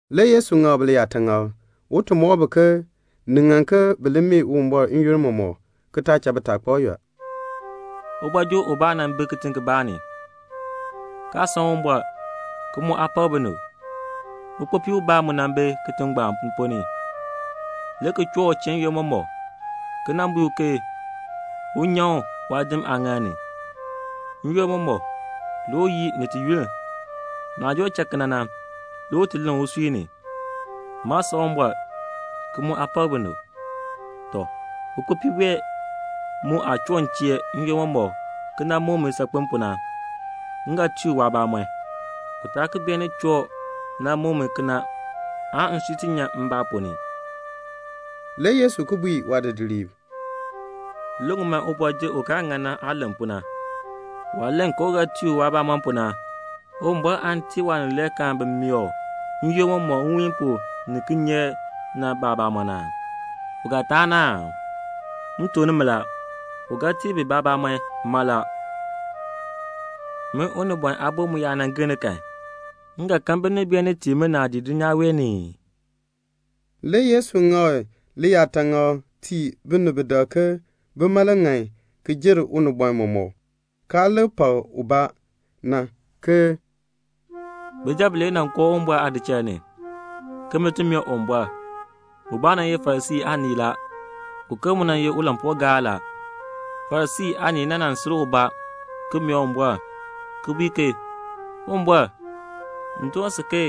Le Yesu ŋak bi liyaataŋakl, un ti mɔk bi ke ni ŋan bi li mee Uwumbɔr n-yoonn mɔmɔk, ki taa cha bitaakpab yɔl. "Ubɔjir ubaa nan bi kitiŋ kibaa ni, kaa san Uwumbɔr, ki mu aa pak binib. Ukpopii ubaa mu nan bi kitiŋ ngbaan ponn ni, le ki choo u chee n-yoonn mɔmɔk, ki bui u ke un nyan u waadin aaŋaal ni. N-yoonn mɔmɔk le u yii ni yunn. Ni joo cha kena na, le u len usui ni, 'Maa san Uwumbɔr, ki mu aa pak binib. Tɔ, ukpopii wee mu aah choo m chee n-yoonn mɔmɔk ki muk mi saakpen pu na, m ga tii u waabamɔn, u taa ki beenin choo nan muk mi kena le nsui ti nyan mbaa ponn ni."' Le Yesu ki bui waadidiliib, "Li ŋun man ubɔjir u kaa ŋan na aah len pu na. Waah len ke u ga tii u waabamɔn pu na, Uwumbɔr aan tii waanileekaan bi mee u n-yoonn mɔmɔk nwiin pu ni kinyeek na baabamɔn aa? U ga yunn aa? M tuk nimi la, u ga tii bi baabamɔn mala. Min Unibɔn Aabo mu yaa gir ni kan, m ga kan binib beenin tii mi naadii dulnyaa wee ni ii?" Le Yesu ŋak liyaataŋakl tii binib bi dak ke bima le ŋan ki jer unibɔn mɔmɔk, kaa lik pak ubaa na, ke "Bijab bilee nan koo Uwumbɔr aadichal ni, ke bin ti mee Uwumbɔr. Ubaa nan ye Farisii aanii la, uken mu nan ye ulampuugaar la. Farisii aanii le nan sil ubaa ki mee Uwumbɔr ki bui ke 'Uwumbɔr, m doon si ke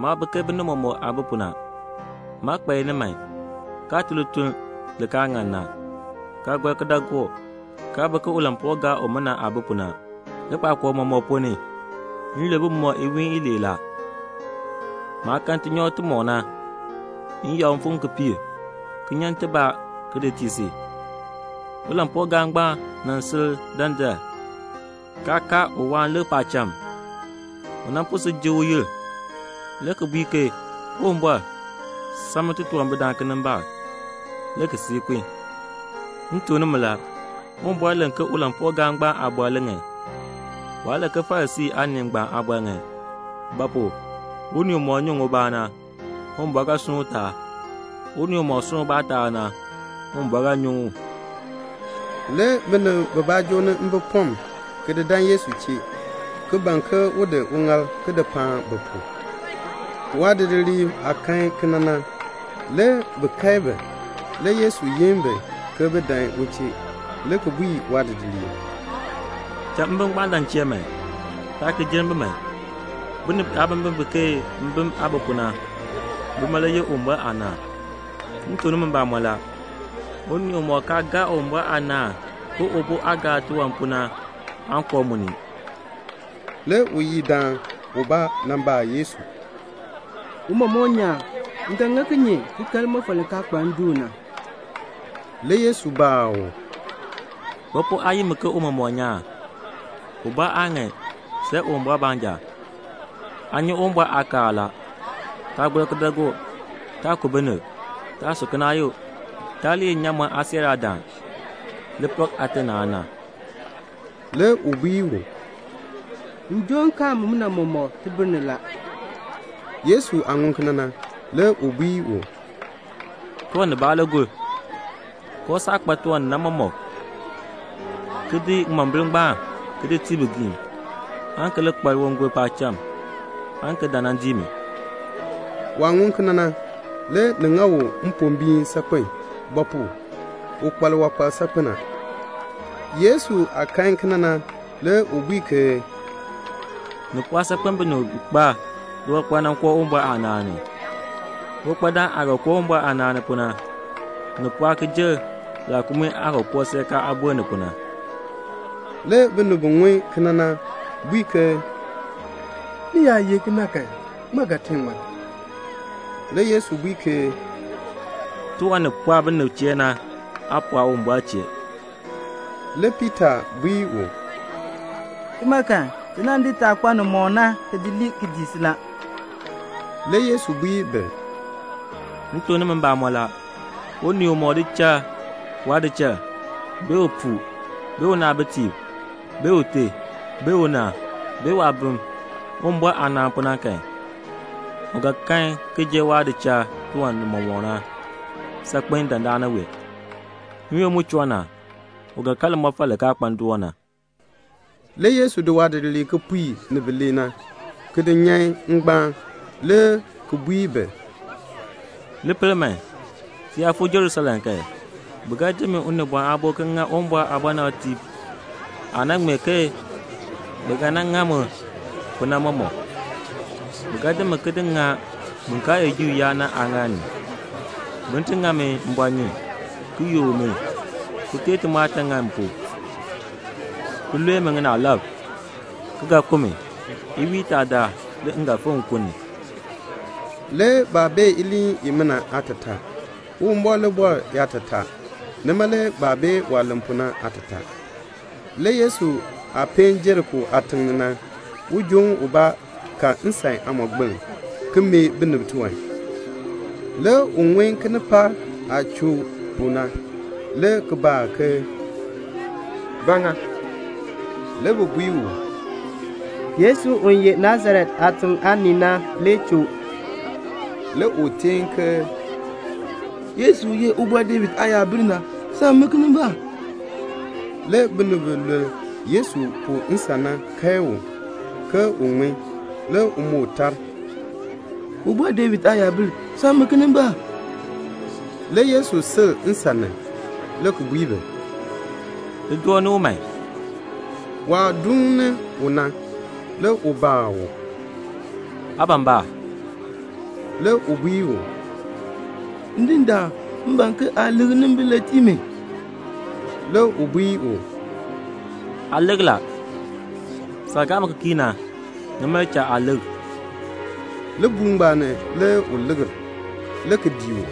maa bi ke binib mɔmɔk aah bi pu na. Maa kpa iniman, kaa tun lituln li kaa ŋan na, kaa gɔr kidaagook, kaa bi ke ulampuugaar umina aah bi pu na. Likpakool mɔmɔk ponn ni, m lul bumɔb iwiin ilee la. Maah kan tinyoor timɔk na, m yakr mfim kipiik ki nyan tibaa ki di tii si.' Ulampuugaar ngbaan le nan sil dandar, kaa kaar un waan lik paacham. U po si jik uyil, le ki bui ke 'Uwumbɔr, sam mi titunwambirdaan kinimbaak,' le ki cha kun. M tuk nimi la, Uwumbɔr len ke ulampuugaar ngbaan aabɔr le ŋan, waa len ke Farisii aanii ngbaan aabɔr ŋan; ba pu? unii umɔk nyuŋ ubaa na, Uwumbɔr ga sunn u taab. Unii umɔk sunn ubaa taab na, Uwumbɔr ga nyuŋ u." Le binib bibaa joo ni mbipɔm, ki di dan Yesu chee, ki ban ke un di uŋaal ki di paan bi pu. Waadidiliib aah kan kena na, le bi kae bi. Le Yesu yin bi, bin dan u chee, le ki bui waadidiliib, "Cha mbim ngbaan dan m chee man. Taa ki jenn bi man. Binib biyaabimbin bi ke mbim aah bi pu na, bima le yeh Uwumbɔr aanaan. M tuk nimi mbamɔn la, unii umɔk kaa gaa Uwumbɔr aanaan ke ubo aah gaar tiwan pu na, waan koo mu ni." Le uyidaan ubaa nan baa Yesu, "Tiicha nyaan, m ga ŋa kinye ki kan limɔfal li kaa kpa ndoon na?" Le Yesu baa u, "Ba pu aa yi mi ke tiicha nyaan? Ubaa aa ŋan, see Uwumbɔr baanja. Aa nyi Uwumbɔr aakaal la: 'Taa gɔr kidaagook; taa ku binib; taa su kinaayuk; taa li ye nnyaamɔn aasiiraadaan; li pak aate ni aana."' Le u bui u, "M joo nkaal mumina mɔmɔk tibir ni la." Yesu aah ŋun kena na, le u bui u, "Tiwan nibaa le gur. Kooh saah kpa tiwan nimɔk na, ki di ŋimombil ngbaan ki di tii bigiim, aan ki li kpa liwangol paacham, aan ki dan nan dii mi." Waah ŋun kena na, le ni ŋa u mpombiin saakpen; ba pu? u kpa liwankpal saakpen a. Yesu aah kan kena na, le u bui ke, "Ni pɔɔ saakpen binib bi kpa liwankpal na koo Uwumbɔr aanaan ni. Uwankpadaan aah ga koo Uwumbɔr aanaan ni pu na, ni pɔɔ ki jer laakumii aah ga koo seerkaa aameer ni pu na." Le binib bi ŋun kena na bui ke "Ni yaa ye kena kan, ŋmaa ga tee ŋmar?" Le Yesu bui ke "Tiwan ni pɔɔ binib chee na, naa pɔɔ Uwumbɔr chee." Le Piita bui u, "Tima kan, ti nan di taah kpa nimɔk na ki di lii, ki dii si la." Le Yesu bui bi, "M tuk nimi mbamɔn la, unii umɔk di cha waadichal, bee upuu, bee unaabitiib, bee ute, bee una, bee waabim, Uwumbɔr aanaan pu na kan, u ga kan ki jer waah di cha tiwan nimɔk na saakpen dandana wee. N-yoonn mu choo na, u ga kan limɔfal li kaa kpa ndoon na." Le Yesu di waadidiliib kipiik ni bilee na, ki di nyan ngbaan, le ki bui bi, "Li pel man, ti yaa fuu Jerusalem kan, bi ga di min Unibɔn Aabo ki ŋa Uwumbɔr aabɔnabtiib aah nan ŋmee ke bi ga nan ŋa mi pu na mɔmɔk. Bi ga di mi ki di ŋa bin kaa ye Juu yaab na aaŋaal ni, bin ti ŋa mi mbɔɔnyun, ki yook mi, ki teei timɔɔtan ŋani m pu, ki lue mi ŋinaalab, ki ga ku mi. Iwiin itaa daal le m ga fikr nkun ni." Le baa bee iliin imina aatataa. Uwumbɔr le bɔr yaatataa. Nima le baa bee waah len pu na aatataa. Le Yesu aah peen Jeriko aatiŋ ni na, ujoon ubaa ka nsan aamɔgbiln, ki mee binib tiwan. Le u ŋun kinipaak aah choo pu na, le ki baa ke "Ba ŋa?" Le bi bui u, "Yesu u ye Nasaret aatiŋ aanii na le choo." Le u teen ke "Yesu, u ye Ubɔr David aayabil na, sam mi kinimbaak." Le binib bi luln Yesu pu nsan na kae u, ke un ŋmin. Le u moo tar, "Ubɔr David aayabil, sam mi kinimbaak." Le Yesu sil nsan ni, le ki bui bi, "Li joo ni u man." Waah duun ni u na, le u baa u, "Aa ban ba?" Le u bui u, "Ndindaan, m ban ke aa likr nnimbil le tii mi." Le u bui u, "Aa likr a. Saah gaa mi ki kii na, nima le cha aa likr." Libuul ngbaan ni le u likr, le ki dii u,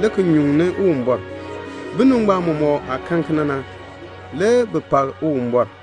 le ki nyuŋni Uwumbɔr. Binib ngbaan mɔmɔk aah kan kena na, le bi pak Uwumbɔr.